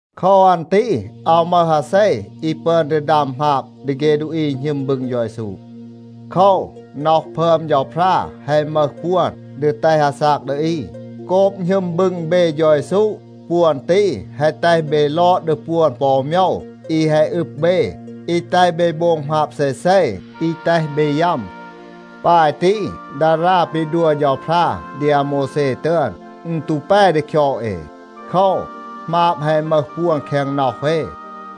โคว อัน ตี อาว มึห อาเซ อี ปึอน ดี ดัม หมาบ ดี เฆ ดูอี อี หณึม บึง เฌา เยซู. โคว, น็อห พึอม เฌาพรา แฮะ มึห ปวน ดี แตห อาซาก ดี อี. โกบ หณึม บึง เบ เฌา เยซู, ปวน ตี แฮะ แตห เบ ลอด ดี ปวน ปอ อู โมยว อี แฮะ อึบ เบ, อี แตห เบ โบง หมาบ เซเซ, อี แตห เบ ยัม. ปาย ตี, ดารา ปี ดัว เฌาพรา ดี อาโมวแซ ตึอน, อึณ ตู แป ดี คยอด เอ. โคว, หมาบ แฮะ มึห ปวน แคง น็อห เอ.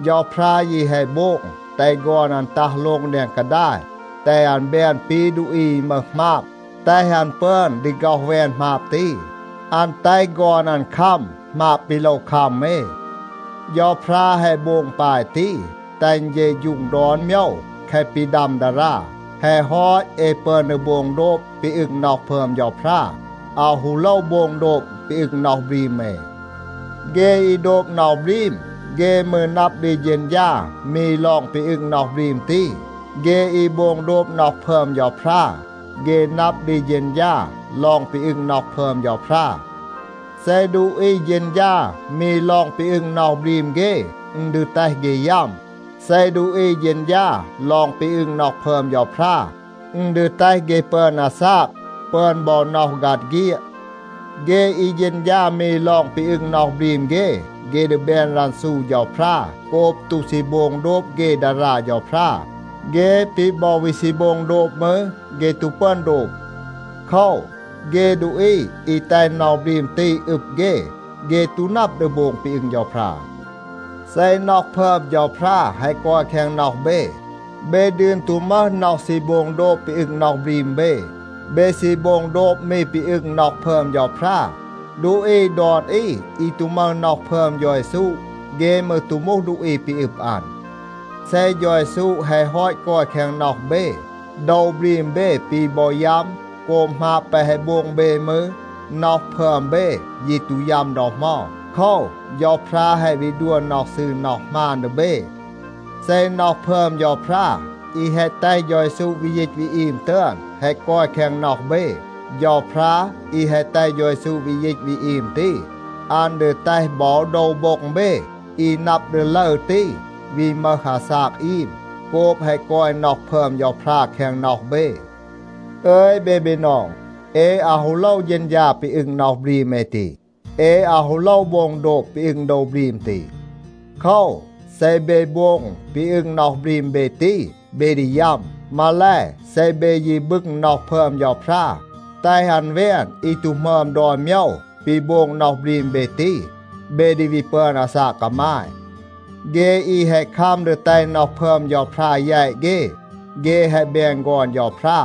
เฌาพรา ยี แฮะ โบง, แตห ฆอน อัน ตัห โลง แดง กาดาย, แตห อัน แบน ปี ดูอี อี มึห หมาบ, แตห อัน ปึอน ดี ฆ็อห แวน หมาบ ตี. อัน แตห ฆอน อัน คัม หมาบ ปี โลว คัม เอ. เฌาพรา แฮะ โบง ปาย ตี, แตห อึณ เฌะฌูง ดอน โมยว แคะ ปี ดัม ดารา. แฮะ ฮอต, เอ ปึอน ดี โบง โดบ ปี อึง น็อห พึอม เฌาพรา, อาว ฮู โลว โบง โดบ ปี อึง น็อห บรีม เอ. เฆ อี โดบ น็อห บรีม, เฆ มืร นับ ดี เฌณฌา มี ลอง ปี อึง น็อห บรีม ตี. เฆ อี โบง โดบ น็อห พึอม เฌาพรา, เฆ นับ ดี เฌณฌา ลอง ปี อึง น็อห พึอม เฌาพรา. เซ ดูอี เฌณฌา มี ลอง ปี อึง น็อห บรีม เฆ, อึณ ดี แตห เฆ ยัม. เซ ดูอี เฌณฌา ลอง ปี อึง น็อห พึอม เฌาพรา, อึณ ดี แตห เฆ ปึอน อาซาก, ปึอน บอ น็อห ฆัด เฆียด. เฆ อี เฌณฌา มี ลอง ปี อึง น็อห บรีม เฆ, เฆ ดี แบน รันซู เฌาพรา โกบ ตู ซี โบง โดบ เฆ ดารา เฌาพรา. เฆ ปี บอ วี ซี โบง โดบ มืร, เฆ ตู ปึอน โดบ. โคว, เฆ ดูอี อี แตห น็อห บรีม ตี อึบ เฆ, เฆ ตู นับ ดี โบง ปี อึง เฌาพรา. เซ น็อห พึอม เฌาพรา แฮะ กอย แคง น็อห เบ, เบ ดืน ตู มึห น็อห ซี โบง โดบ ปี อึง น็อห บรีม เบ. เบ ซี โบง โดบ มี ปี อึง น็อห พึอม เฌาพรา. ดูอี ดอน อี อี ตู มึห น็อห พึอม เฌา เยซู, เฆ มืร ตู มูห ดูอี ปี อึบ อัน. เซ เฌา เยซู แฮะ ฮอต กอย แคง น็อห เบ, โดว บรีม เบ ปี บอ ยัม โกบ หมาบ แปะ แฮะ โบง เบ มืร, น็อห พึอม เบ ยี ตู ยัม ดอ เหมา. โคว, เฌาพรา แฮะ วี ดัว น็อห ซืร น็อห หมาน ดี เบ. เซ น็อห พึอม เฌาพรา อี แฮะ แตห เฌา เยซู วี ยีต วี อีม ตึอน แฮะ กอย แคง น็อห เบ, เฌาพรา อี แฮะ แตห เฌา เยซู วี ยีต วี อีม ตี, อัน ดี แตห บอ โดว โบ็ง เบ อี นับ ดี ลึร ตี วี มึห อาซาก อีม โกบ แฮะ กอย น็อห พึอม เฌาพรา แคง น็อห เบ. อึย เบ บีนอง, เอ อาว ฮู โลว เฌณฌา ปี อึง น็อห บรีม เอ ตี. เอ อาว ฮู โลว โบง โดบ ปี อึง โดว บรีม ตี. โคว, เซ เบ โบง ปี อึง น็อห บรีม เบ ตี, เบ ดี ยัม. มาแล, เซ เบ ยี บึง น็อห พึอม เฌาพรา, แตห อัน แวน อี ตู หมึอม ดอน โมยว ปี โบง น็อห บรีม เบ ตี, เบ ดี วี ปึอน อาซาก กามาย. เฆ อี แฮะ คัม ดี แตห น็อห พึอม เฌาพรา แยต เฆ, เฆ แฮะ แบน ฆอน เฌาพรา.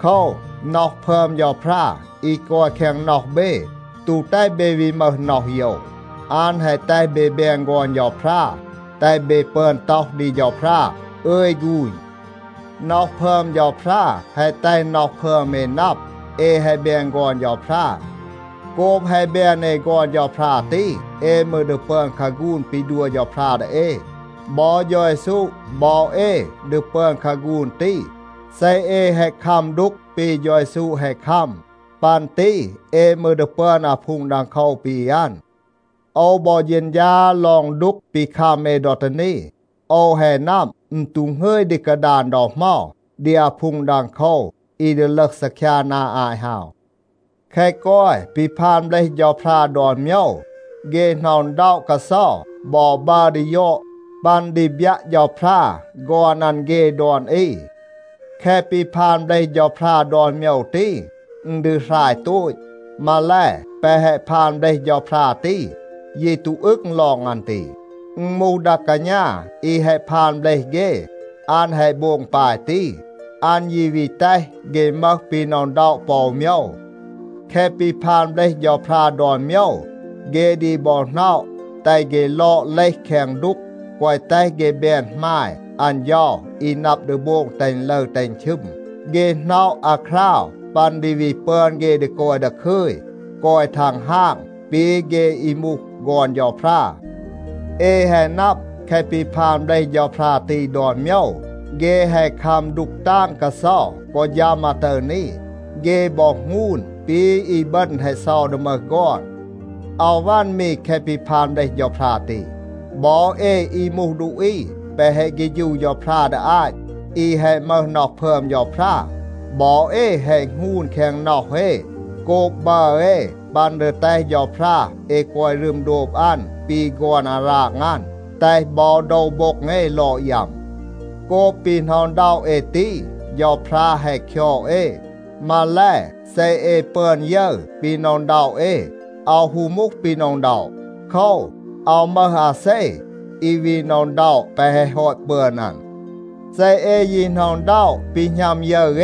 โคว, น็อห พึอม เฌาพรา อี กอย แคง น็อห เบ ตู แตห เบ วี มึห น็อห โยว. อัน แฮะ แตห เบ แบน ฆอน เฌาพรา, แตห เบ ปึอน ต็อห ดี เฌาพรา, “อึย ฆูณ.” น็อห พึอม เฌาพรา, แฮะ แตห น็อห พึอม เอ นับ, เอ แฮะ แบน ฆอน เฌาพรา. โกบ แฮะ แบน เอ ฆอน เฌาพรา ตี, เอ มืร ดี ปึอน คาฆูน ปี ดัว เฌาพรา ดี เอ. บอ เฌา เยซู บอ เอ ดี ปึอน คาฆูน ตี เซ เอ แฮะ คัม ดูก ปี เฌา เยซู แฮะ คัม. ปัน ตี เอ มืร ดี ปึอน อาพูง ดังโคว ปี อัน. โอว บอ เฌณฌา ลอง ดูก ปี คัม เอ ดอ ตี นี. โอว แฮะ นับ, อึณ ตู หงึย ดี กาดาน ดอ เหมา ดี อาพูง ดังโคว อี ดี ลึห ซีคยา นา อาต ฮาว. แคะ กอย ปี พาน เบลห เฌาพรา ดอน โมยว, เฆ หน็อะ อึณด็อะ กาเซา บอ บัร ดี ยอด ปัน ดี บยัะ เฌาพรา ฆอน อัน เฆ ดอน อี. แคะ ปี พาน เบลห เฌาพรา ดอน โมยว ตี, อึณ ดี หราย โตต. มาแล, แปะ แฮะ พาน เบลห เฌาพรา ตี ยี ตู อึง ลอง อัน ตี. อึณ มูห ดา กาณา อี แฮะ พาน เบลห เฆ, อัน แฮะ โบง ปาย ตี. อัน ยี วี แตห เฆ มึห ปี หน็อะ อึณด็อะ ปอ อู โมยว. แคะ ปี พาน เบลห เฌาพรา ดอน โมยว, เฆ ดี บอ หน็อะ แตห เฆ ลอด เลห แคง ดูก, แกวะ แตห เฆ แบน หมาย อัน เฌา อี นับ ดี โบง แตห อึณ ลึร แตห อึณ ชึม. เฆ หน็อะ อาคราว ปัน ดี วี ปึอน เฆ ดี กอย ดาคึย, กอย ทังฮาง ปี เฆ อี มูห ฆอน เฌาพรา. เอ แฮะ นับ แคะ ปี พาน เบลห เฌาพรา ตี ดอน โมยว, เฆ แฮะ คัม ดูก ตาง กาเซา กอ ฌัม อาตึร นี. เฆ บอ หงูน ปี อีบึณ แฮะ เซา ดี มึห ฆอน. อาว วัน มี แคะ ปี พาน เบลห เฌาพรา ตี. บอ เอ อี มูห ดูอี แปะ แฮะ เฆฌู เฌาพรา ดี อาต, อี แฮะ มึห น็อห พึอม เฌาพรา, บอ เอ แฮะ หงูน แคง น็อห เอ โกบ บัร เอ ปัน ดี แตห เฌาพรา เอ กอย รึม โดบ อัน ปี ฆอน อาราง อัน, แตห บอ โดว โบ็ง เอ ลอด ยัม. โกบ ปี หน็อะ อึณด็อะ เอ ตี, เฌาพรา แฮะ คยอด เอ. มาแล, เซ เอ ปึอน ยึร ปี หน็อะ อึณด็อะ เอ, อาว ฮู มูห ปี หน็อะ อึณด็อะ. โคว, อาว มึห อาเซ อี วี หน็อะ อึณด็อะ แปะ แฮะ ฮอต ปึอน อัน. เซ เอ ยี หน็อะ อึณด็อะ ปี หณัม ยึร เอ,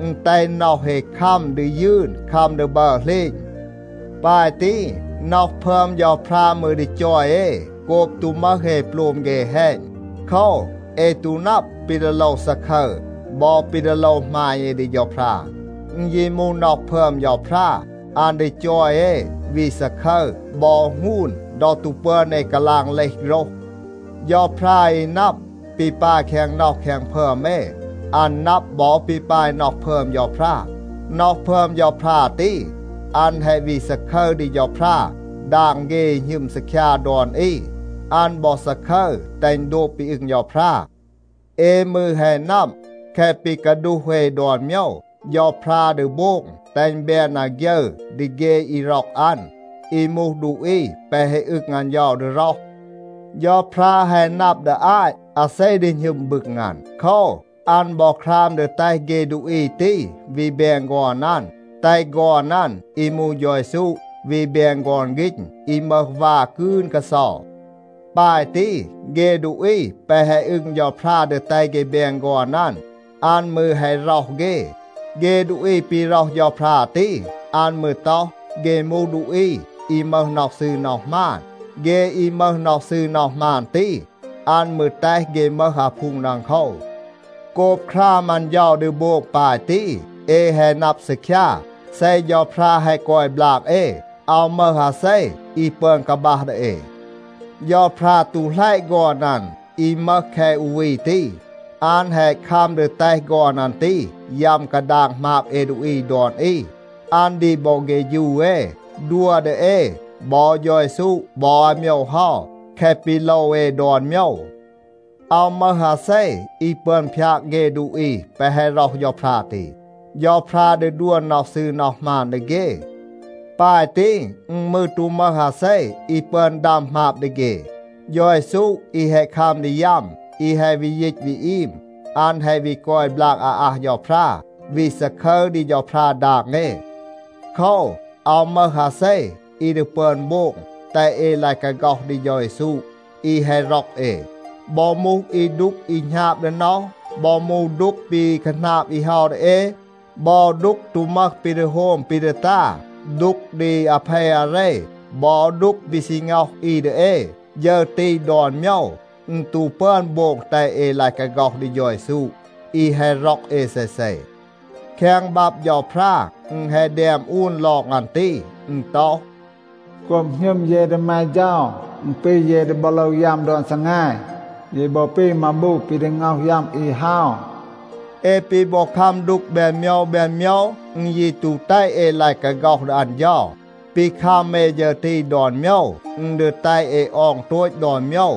อึณ แตห น็อห เอ คัม ดี ยืน คัม ดี บัร เหลณ. ปาย ตี, น็อห พึอม เฌาพรา มืร ดี จอย เอ โกบ ตู มึห เอ โปลม เฆ แฮณ. โคว, เอ ตู นับ ปี ดี โลว ซาคึร บอ ปี ดี โลว หมาณ เอ ดี เฌาพรา. อึณ ยี มูห น็อห พึอม เฌาพรา, อัน ดี จอย เอ วี ซาคึร บอ หงูน ดอ ตู ปึอน เอ กาลาง เลห โฆรห. เฌาพรา อี นับ ปี ปาย แคง น็อห แคง พึอม เอ, อัน นับ บอ ปี ปาย น็อห พึอม เฌาพรา. น็อห พึอม เฌาพรา ตี, อัน แฮะ วี ซาคึร ดี เฌาพรา ดาง เฆ อี หณึม ซีคยา ดอน อี. อัน บอ ซาคึร แตห อึณ โดบ ปี อึง เฌาพรา. เอ มืร แฮะ นับ, แคะ ปี กาดูห เอ ดอน โมยว, เฌาพรา ดี โบง แตห อึณ แบน อาฆยึร ดี เฆ อี ร็อก อัน, อี มูห ดูอี แปะ แฮะ อึง อัน เฌา ดี ร็อห. เฌาพรา แฮะ นับ ดี อาต อาเซ ดี หณึม บึง อัน. โคว, อัน บอ คราม ดี แตห เฆ ดูอี ตี วี แบน ฆอน อัน, แตห ฆอน อัน อี มูห เฌา เยซู วี แบน ฆอน ฆีณ อี มึห วา กืน กาเซา. ปาย ตี, เฆ ดูอี แปะ แฮะ อึง เฌาพรา ดี แตห เฆ แบน ฆอน อัน, อัน มืร แฮะ ร็อห เฆ. เฆ ดูอี ปี ร็อห เฌาพรา ตี, อัน มืร ต็อห, เฆ มูห ดูอี อี มึห น็อห ซืร น็อห หมาน. เฆ อี มึห น็อห ซืร น็อห หมาน ตี, อัน มืร แตห เฆ มึห อาพูง ดังโคว. โกบ คราม อัน เฌา ดี โบง ปาย ตี, เอ แฮะ นับ ซีคยา, เซ เฌาพรา แฮะ กอย บลาก เอ, อาว มึห อาเซ อี ปึอน กาบัห ดี เอ. เฌาพรา ตู หลัยะ ฆอน อัน อี มึห แคะ อู วี ตี. อัน แฮะ คัม ดี แตห ฆอน อัน ตี ยัม กาดาง หมาบ เอ ดูอี ดอน อี. อัน ดี บอ เฆฌู เอ, ดัว ดี เอ บอ เฌา เยซู บอ อาโมยว เฮา, แคะ ปี โลว เอ ดอน โมยว. อาว มึห อาเซ อี ปึอน พยาก เฆ ดูอี แปะ แฮะ ร็อห เฌาพรา ตี. เฌาพรา ดี ดัว น็อห ซืร น็อห หมาน ดี เฆ. ปาย ตี, อึณ มืร ตู มึห อาเซ อี ปึอน ดัม หมาบ ดี เฆ. เฌา เยซู อี แฮะ คัม ดี ยัม, อี แฮะ วี ยีต วี อีม, อัน แฮะ วี กอย บลาก อาอัห เฌาพรา, วี ซาคึร ดี เฌาพรา ดาง เอ. โคว, อาว มึห มาเซ อี ดี ปึอน โบง แตห เอ ลาย กาฆ็อห ดี เฌา เยซู อี แฮะ ร็อก เอ. บอ มูห อี ดูก อี หณาบ ดี น็อห, บอ มูห ดูก ปี คาหนาบ อี เฮา ดี เอ บอ ดูก ตู มึห ปี ดี โฮม ปี ดี ตา, ดูก ดี อาเพ อาเร บอ ดูก ปี ซี ง็อห อี ดี เอ, ฌึร ตี ดอน โมยว, อึณ ตู ปึอน โบง แตห เอ ลาย กาฆ็อห ดี เฌา เยซู อี แฮะ ร็อก เอ เซเซ. แคง บับ เฌาพรา อึณ แฮะ แดม อูน ลอง อัน ตี. อึณ ต็อห, “โกบ หณึม เย ดี แม เฌา, อึณ ปี เย ดี บอ โลว ยัม ดอน ซีแง. เย บอ ปี มาบู ปี ดี ง็อห ยัม อี เฮา.” เอ ปี บอ คัม ดูก แบน โมยว แบน โมยว, อึณ ยี ตู แตห เอ ลาย กาฆ็อห ดี อัน เฌา. ปี คัม เอ ฌึร ตี ดอน โมยว, อึณ ดี แตห เอ ออง โตต ดอน โมยว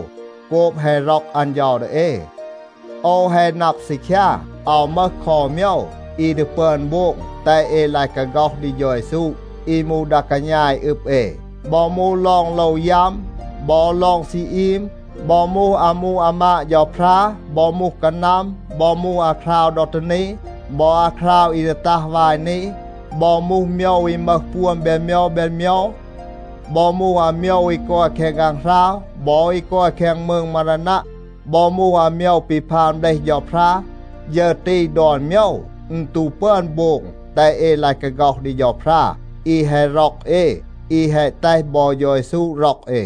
โกบ แฮะ ร็อก อัน เฌา ดี เอ. โอว แฮะ นับ ซีคยา, อาว มึห คอ อู โมยว อี ดี ปึอน โบง แตห เอ ลาย กาฆ็อห ดี เฌา เยซู อี มูห ดา กาณา อี อึบ เอ. บอ มูห ลอง โลว ยัม บอ ลอง ซี อีม, บอ มูห อามู อามาด เฌาพรา, บอ มูห กานัม, บอ มูห อาคราว ดอ ตี นี บอ อาคราว อี ดี ตัห วาย นี, บอ มูห โมยว อี มึห ปวน แบน โมยว แบน โมยว, บอ มูห อาโมยว อี กอย แคง ฆางหราว บอ อี กอย แคง มืง มารานัะ, บอ มูห อาโมยว ปี พาน เบลห เฌาพรา, ฌึร ตี ดอน โมยว, อึณ ตู ปึอน โบง แตห เอ ลาย กาฆ็อห ดี เฌาพรา อี แฮะ ร็อก เอ, อี แฮะ แตห บอ เฌา เยซู ร็อก เอ.